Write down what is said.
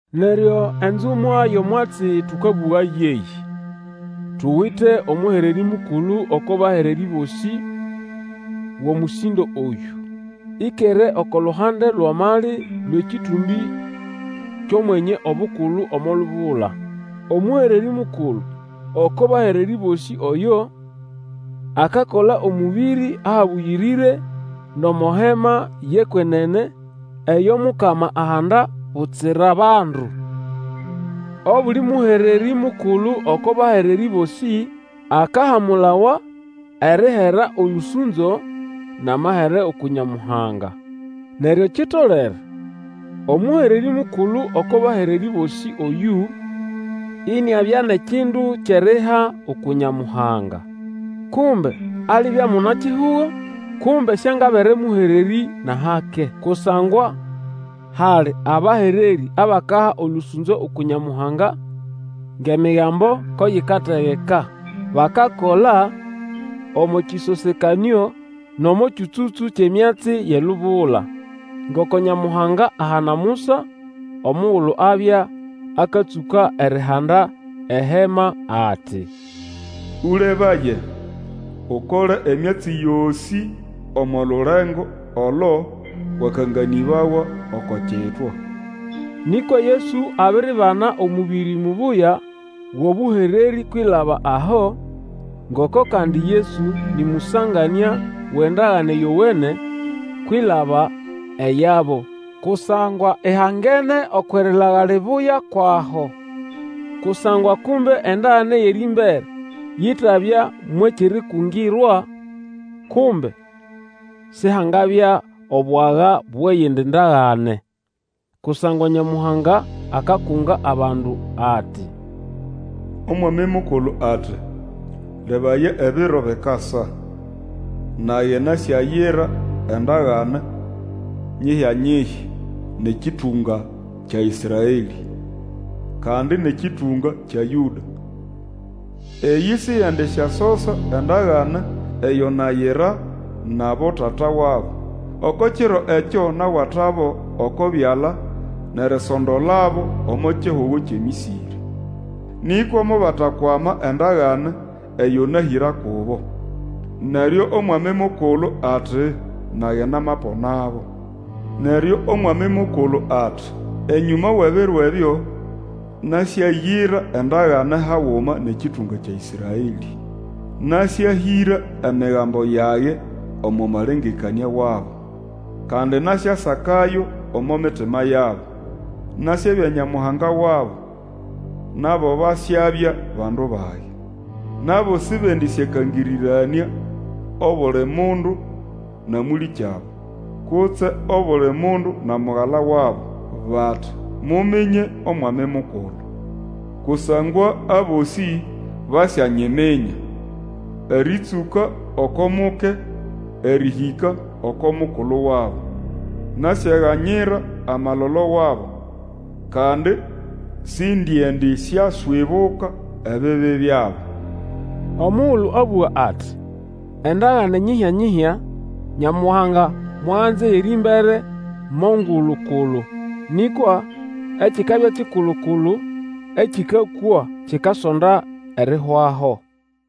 Neryo enzumwa yʼomwatsi tũkabũga yeyĩ: tuwite omũhererĩ mukulu oko bahererĩ bosĩ wʼomũsĩndo oyũ. Ĩkere oko luhande lwʼamali lwʼekĩtũmbĩ kyʼOmwenye Obukulu omo lubula. Omũhererĩ mukulu oko bahererĩ bosĩ oyo, akakola omũbĩrĩ ahabũyĩrĩre, nʼomo Hema yʼekwenene eyo Mukama ahanda, butsira bandu. Obuli mũhererĩ mukulu oko bahererĩ bosĩ, akahamulawa erihera olũsũnzo nʼamahere uku Nyamuhanga. Neryo kitolere omũhererĩ mukulu oko bahererĩ bosĩ oyũ iniabya nʼekindu kyʼeriha uku Nyamuhanga. Kumbe alibya muna-kihugo, kumbe siangabere mũhererĩ nʼahake. Kusangwa hali abahererĩ abakaha olũsũnzo uku Nyamuhanga ngʼEmigambo ko yikategeka. Bakakola omo kĩsosekanĩo nʼomo kyũtsũtsũ kyʼemyatsi yʼelubula. Ngoko Nyamuhanga ahana Musa omugulu abya akatsũka erihanda eHema ati, Ũlebaye, Ukole emyatsi yosĩ omo lulengo olo wakanganĩbawa oko kitwa. Nĩkwa Yesu abiribana omũbĩrĩ mubuya wʼobũhererĩ kwilaba aho, ngoko kandi Yesu nĩ mũsanganĩa wʼendagane yowene kwilaba eyabo, kusangwa ihangene okwʼerilaga libuya kwʼaho. Kusangwa kumbe endagane yʼerĩmbere yitabya mwʼekyʼerikungirwa, kumbe Sihangabya obwaga bwʼeyindi ndagane. Kusangwa Nyamuhanga akakunga abandu ati, Omwami Mukulu ati, Lebaya ebiro bikasa, Nage nasyayira endagane nyihya-nyihya nʼekĩtũnga kya Ĩsraelĩ, Kandi nʼekĩtũnga kya Yũda. Eyĩ siyendisyasosa endagane eyo nayira nʼabotata wabo. Oko kiro ekyo nawatabo oko byala nʼerisondolabo omo kihugo kyʼeMĩsĩrĩ. Nĩkwa mobatakwama endagane eyo nahĩra kubo, Neryo Omwami Mukulu ati, Nage namaponabo. Neryo Omwami Mukulu ati, Enyũma wʼebiro ebyo, nasyayira endagane haguma nʼekĩtũnga kya Ĩsraelĩ; Nasyahĩra Emigambo yage omo malengekanĩa wabo, Kandi nasyasakayo omo mitima yabo. Nasyabya Nyamuhanga wabo, Nabo basyabya bandu bage. Nabo sibendĩsyakangĩrĩranĩa obuli mundu na mũlĩkyabo, Kutse obuli mundu na mugala wabo, bati, Muminye Omwami Mukulu, Kusangwa abosĩ basyanyiminya, Erĩtsũka oko muke erĩhĩka oko mukulu wabo. Nasyaganyira amalolo wabo, Kandi sindiendisyaswibuka ebibi byabo. Omugulu abũga ati, Endagane nyihya-nyihya, Nyamuhanga mwaganza eyʼerĩmbere mo ngulu-kulu. Nĩkwa ekikabya kikulu-kulu, ekĩkakwa, kikasonda erihwaho.